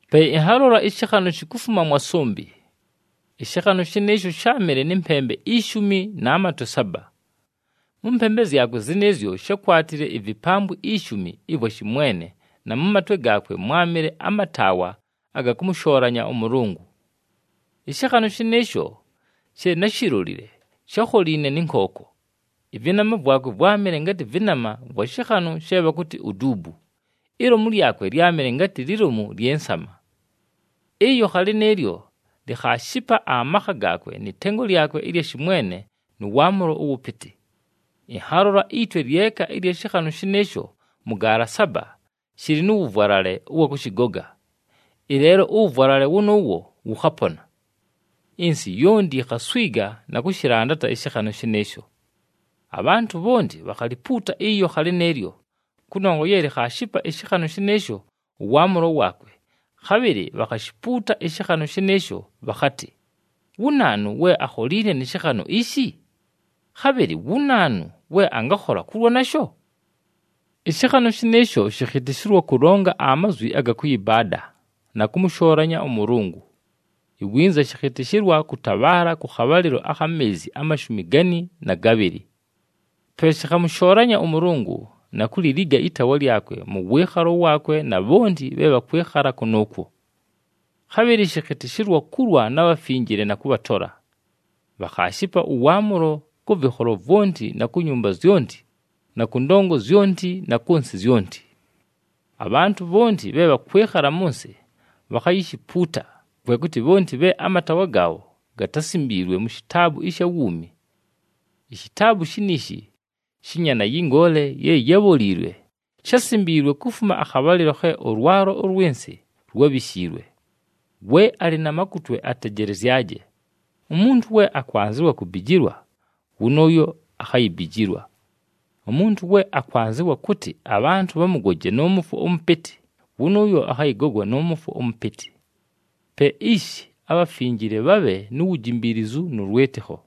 Pe ɨnhalola ɨshɨkhanʉ shikufuma mwa sʉmbɨ. Ɨshɨkhanʉ shɨnɨɨsho sháamɨle nɨ mpembe ishumi na matwe saba. Mʉ mpembe zyakwe zɨnɨɨzyo shákwatile ivipambwi ishumi ɨvwa shɨmwene na mʉ matwe gaakwe mwámɨle amataawa aga kʉmʉshoolanya ʉMʉlʉngʉ. Ɨshɨkhanʉ shɨnɨɨsho she náshilolile shákholiine nɨ nkooko, ɨvɨnama vwakwe vwámɨle ngatɨ vɨnama vwa shɨkhanʉ she bhakʉtɨ uduubu, ilomu lyakwe lyámɨle ngatɨ lilomu lyɨ nsama. Ɨyokha lɨnɨɨlyo likhaashipa amakha gaakwe nɨ tengo lyakwe ɨlya shɨmwene nʉ waamʉlo ʉwʉpɨtɨ. Ɨnhalola itwe lyeka ɨlya shɨkhanʉ shɨnɨɨsho mʉ gaala saba shɨlɨ nʉ wʉvwalale ʉwa kʉshɨgoga. Ɨleelo ʉwʉvwalale wʉnʉʉwo wʉkhapona! Ɨnsɨ yonti yikhaswiga na kʉshɨlandata ɨshɨkhanʉ shɨnɨɨsho. Abhantʉ bhonti bhakhalipuuta ɨyokha lɨnɨɨlyo, kʉnongwa ye likhaashipa ɨshɨkhanʉ shɨnɨɨsho ʉwaamʉlo waakwe, khabhɨlɨ bhakhashipuuta ɨshɨkhanʉ shɨnɨɨsho, bhakhatɨ, “Wu naanu we akholiine nɨ shɨkhanʉ ishi? Khabhɨlɨ wu naanu we angakhola kulwa nasho?” Ɨshɨkhanʉ shɨnɨɨsho shɨkhɨtɨshɨlwa kʉlonga amazwi aga kʉyɨbaada, na kʉmʉshoolanya ʉMʉlʉngʉ. Iwinza shɨkhɨtɨshɨlwa kʉtabhaala kʉ khabhalɨlo akha meezi amashumi gani na gabhɨlɨ. Pe shɨkhamʉshoolanya ʉMʉlʉngʉ, na kuliliga ɨtaawa lyakwe nʉ wɨɨkhalo waakwe na bhonti bhe bhakwɨkhala kʉnʉʉkwo. Khabhɨlɨ shɨkhɨtɨshɨlwa kulwa na bhafinjile na kʉbhatola. Bhakhaashipa ʉwaamʉlo kʉ vɨkholo vwonti na ku nyumba zyonti na kʉ ndongo zyonti na kʉ nsɨ zyonti. Abhantʉ bhonti bhe bhakwɨkhala mʉ nsɨ bhakhayishipuuta, kwe kʉtɨ bhonti bhe amataawa gaabho gatásimbiilwe mu shitaabu ɨsha wuumi. Ishitaabu shiniishi shɨ Nyaana yɨ Ngoole ye yábholiilwe, shásimbiilwe kufuma akhabhalɨlo khe ʉlwalo ʉlwɨ nsɨ lwábhishiilwe. We alɨ na makutwe atejelezyaje. Umuntu we akwanzɨwa kubijilwa, wʉnʉʉyo akhayibijilwa. Umuntu we akwanzɨwa kʉtɨ abhantʉ bhamʉgoje nʉ mʉfwo ʉmʉpɨtɨ, wʉnʉʉyo akhayɨgogwa nʉ mʉfwo ʉmʉpɨtɨ. Pe ishi, abhafinjile bhabhe nu wujimbiilizu nʉ lwɨtɨkho.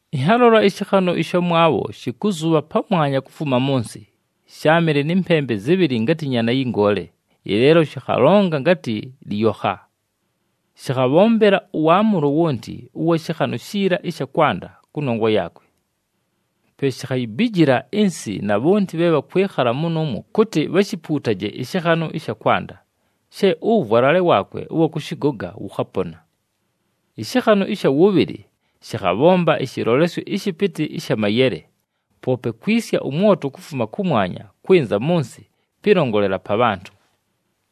Ɨnhalola ɨshɨkhanʉ ɨshamwabho, shɨkʉzʉbha pamwanya kufuma mʉ nsɨ, sháamɨle nɨ mpembe zɨbhɨlɨ ngatɨ nyaana yɨ ngoole, ɨleelo shɨkhalonga ngatɨ lɨyokha. Shɨkhabhombela ʉwaamʉlo wonti ʉwa shɨkhanʉ shiila ɨsha kwanda kʉnongwa yaakwe. Pe shikhayibijila ɨnsɨ na bhonti bhe bhakwɨkhala mʉnʉʉmwo kʉtɨ bhashipuutaje ɨshɨkhanʉ ɨsha kwanda, she ʉwʉvwalale waakwe ʉwa kʉshɨgoga wʉkhapona. Ɨshɨkhanʉ ɨsha wʉbhɨlɨ shɨkhabhomba ɨshɨlolesyo ɨshɨpɨtɨ ɨsha mayele, poope kwisya ʉmwoto kufuma kʉmwanya kwɨnza mʉ nsɨ pɨlongolela pa bhantʉ.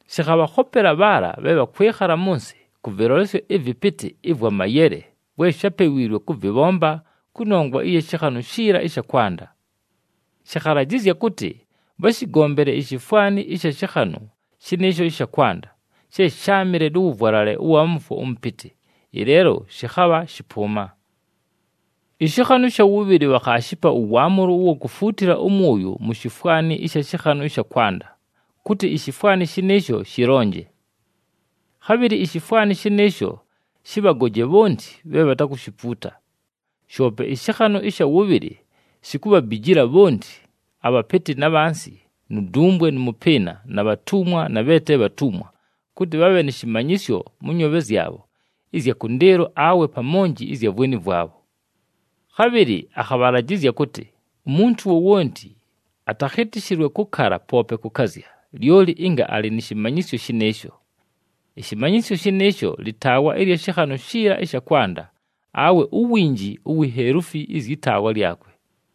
Shɨkhabhakhopela bhaala bhe bhakwɨkhala mʉ nsɨ, kʉ vɨlolesyo ɨvɨpɨtɨ ɨvwa mayele vwe shápewiilwe kʉvɨbhomba kʉnongwa ɨya shɨkhanʉ shiila ɨsha kwanda. Shɨkhalajɨzya kʉtɨ bhashɨgombele ishifwani ɨsha shɨkhanʉ shɨnɨɨsho ɨsha kwanda, she sháamɨle nʉ wʉvwalale ʉwa mʉfwo ʉmʉpɨtɨ, ɨleelo shɨkhabha shɨpʉʉma. Ɨshɨkhanʉ ɨsha wʉbhɨlɨ bhakhaashipa ʉwaamʉlo ʉwa kufuutila ʉmwʉyʉ mu shifwani ɨsha shɨkhanʉ ɨsha kwanda, kʉtɨ ishifwani shɨnɨɨsho shɨlonje. Khabhɨlɨ ishifwani shɨnɨɨsho shɨbhagoje bhonti bhe bhatakushipuuta. Shoope ɨshɨkhanʉ ɨsha wʉbhɨlɨ shikubhabijila bhonti, abhapɨtɨ na bhansi nu dumbwe nʉ mʉpɨɨna na bhatumwa na bhe te bhatumwa kʉtɨ bhabhe nɨ shɨmanyɨsyo mʉ nyoobhe zyabho ɨzya kʉndɨɨlo awe pa monji ɨzya vweni vwabho. Khabhɨlɨ akhabhalajɨzya kʉtɨ umuntu wowonti atakhɨtɨshɨlwe kʉkala poope kʉkazya, lyoli ɨnga alɨ nɨ shɨmanyɨsyo shɨnɨɨsho. Ɨshɨmanyɨsyo shɨnɨɨsho lɨtaawa ɨlya shɨkhanʉ shiila ɨsha kwanda, awe uwinji uwi heluufi ɨzyɨ taawa lyakwe.